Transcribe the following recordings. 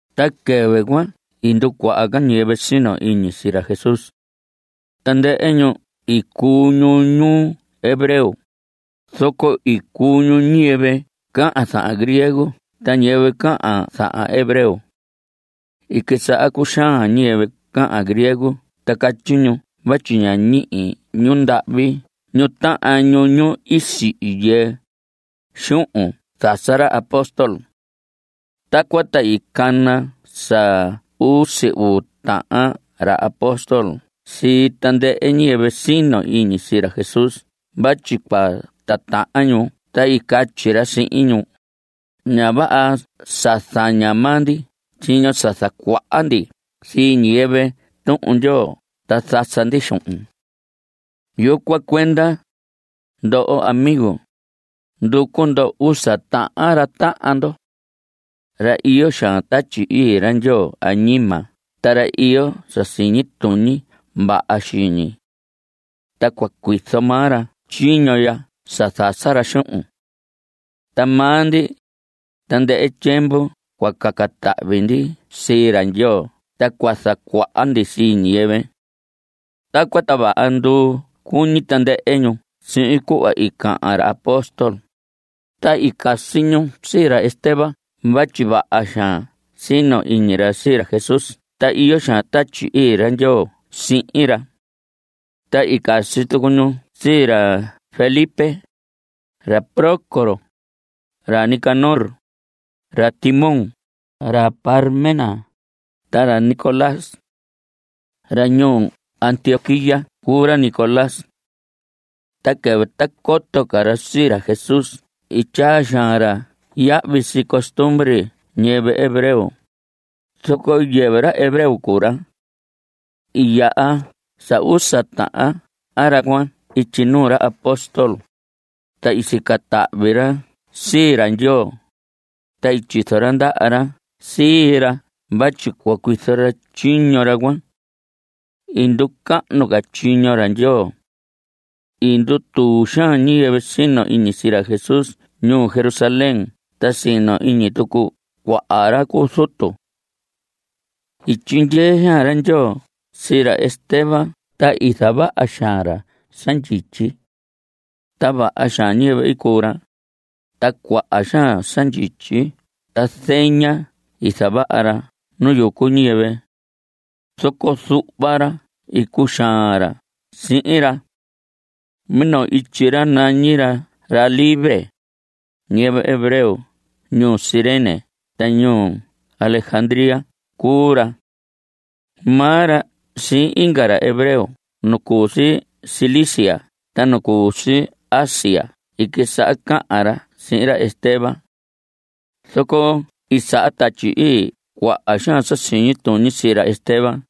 Ta quɨvɨ cuan i nducuaha ca ñiyɨvɨ sino iñi sii ra Jesús. Tandɨhɨ ñu i cuu ñu ñu hebreo, zoco i cuu ñu ñiyɨvɨ cahan zahan griego ta ñiyɨvɨ cahan zahan hebreo. I quisaha cuxaan ñiyɨvɨ cahan griego ta catyi ñu vatyi ña ñihi ñundahvi ñu tahan ñu, ñu sihi yɨɨ, xuhun i zasa ra apóstol. Tacuan ta i cana sa usi uu tahan ra apóstol sii tandɨhɨ ñiyɨvɨ sino iñi sii ra Jesús vatyi cua titahan ñu ta i catyi ra sihin ñu: Ña vaha sa zaña maa ndi tyiño sa zacuaha ndi sii ñiyɨvɨ Tuhun Ndyoo ta zasa ndi xuhun. Yucuan cuenda, ndoho amigo, nducu ndo usa tahan ra tahan ndo. Ra iyo xaan Tatyi Ii ra Ndyoo añima ta ra iyo sa siñi tuñi vaha xiñi. Ta cua cuizo maa ra tyiño ya sa zasa ra xuhun. Ta maa ndi, tandɨhɨ tyiemvu cua caca tahvi ndi sii ra Ndyoo ta cua zacuaha ndi sii ñiyɨvɨ. Tacuan, ta vaha nduu cuñi tandɨhɨ ñu sihin cuhva i cahan ra apóstol, ta i casi ñu sii ra Esteban vatyi vaha xaan sino iñi ra sii ra Jesús ta iyo xaan Tatyi Ii ra Ndyoo sihin ra. Ta i casi tucu ñu sii ra Felipe, ra Prócoro, ra Nicanor, ra Timón, ra Parmenas, ta ra Nicolás. Ra ñuu Antioquía cuu ra Nicolás. Ta quɨvɨ ta coto ca ra sii ra Jesús i tyaa xaan ra yahvi sii costumbre ñiyɨvɨ hebreo. Zoco yɨvɨ ra hebreo cuu ra. I yaha sa usa tahan ra cuan ityi nuu ra apóstol, ta i sica tahvi ra sii ra Ndyoo, ta i tyizo ra ndaha ra sii ra vatyi cua cuizo tyiño ra cuan. I nducahnu ca tyiño ra Ndyoo. I ndutuu xaan ñiyɨvɨ sino iñi sii ra Jesús ñuu Jerusalén ta sino iñi tucu cuaha ra cu zutu. I tyindyee xaan ra Ndyoo sii ra Esteban ta i zavaha xaan ra sa ndyityi. Ta vaha xaan ñiyɨvɨ i cuu ra. Ta cuaha xaan sa ndyityi ta zeña i zavaha ra nu yucu ñiyɨvɨ. Zoco zuhva ra i cuxaan ra sihin ra. Minoo ityi ra nañi ra ra libre. Ñiyɨvɨ hebreo ñuu Cirene ta ñuu Alexandría cuu ra. Maa ra sihin inga ra hebreo nu cu si Cilicia ta nu cu si Asia i quisaha cahan ra sihin ra Esteban. Zoco i saha Tatyi Ii cuaha xaan sa siñi tuñi sii ra Esteban,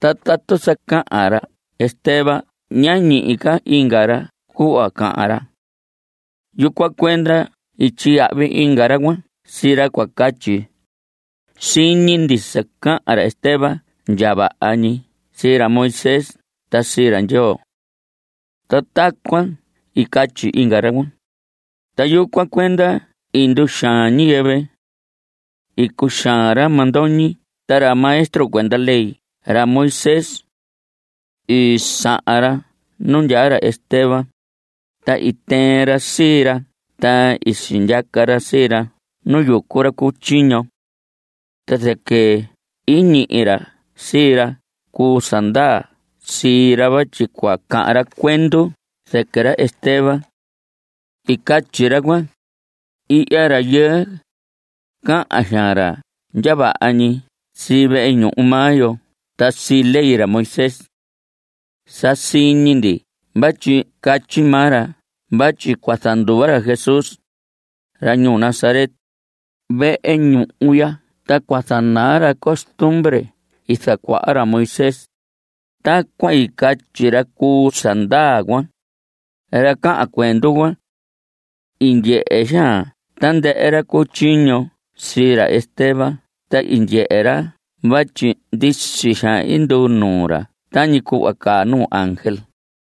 ta tatu sa cahan ra Esteban ña ñihi ca inga ra cuhva cahan ra. Yucuan cuenda i tyiyahvi inga ra cuan sii ra cua catyi: “Siñi ndi sa cahan ra Esteban ndya vaha ñi sii ra Moisés ta sii ra Ndyoo.” Ta tacuan i catyi inga ra cuan. Ta yucuan cuenda i nduxaan ñiyɨvɨ. I cuxaan ra mandoñi ta ra maestro cuenda ley ra Moisés. I sahan ra nu ndyaa ra Esteban, ta i tɨɨn ra sii ra ta i sindyaca ra sii ra nu yucu ra cu tyiño. Ta zɨquɨ i ñihi ra sii ra cu sa ndaa sii ra vatyi cua cahan ra cuendu zɨquɨ ra Esteban. I catyi ra cuan: Ihya rayɨɨ, cahan xaan ra ndya vaha ñi sii vehe ñuhu maa yo ta sii ley ra Moisés. Sa siñi ndi vatyi catyi maa ra vatyi cua zanduva ra Jesús, ra ñuu Nazaret, vehe ñuhu ya ta cua zanaa ra costumbre i zacuaha ra Moisés. Tacuan i catyi ra cu sa ndaa cuan, ra cahan cuendu cuan. I ndyehe xaan tandɨhɨ ra cu tyiño sii ra Esteban ta i ndyehe ra vatyi ndisi xaan i nduu nuu ra tañi cuhva caa nuu ángel.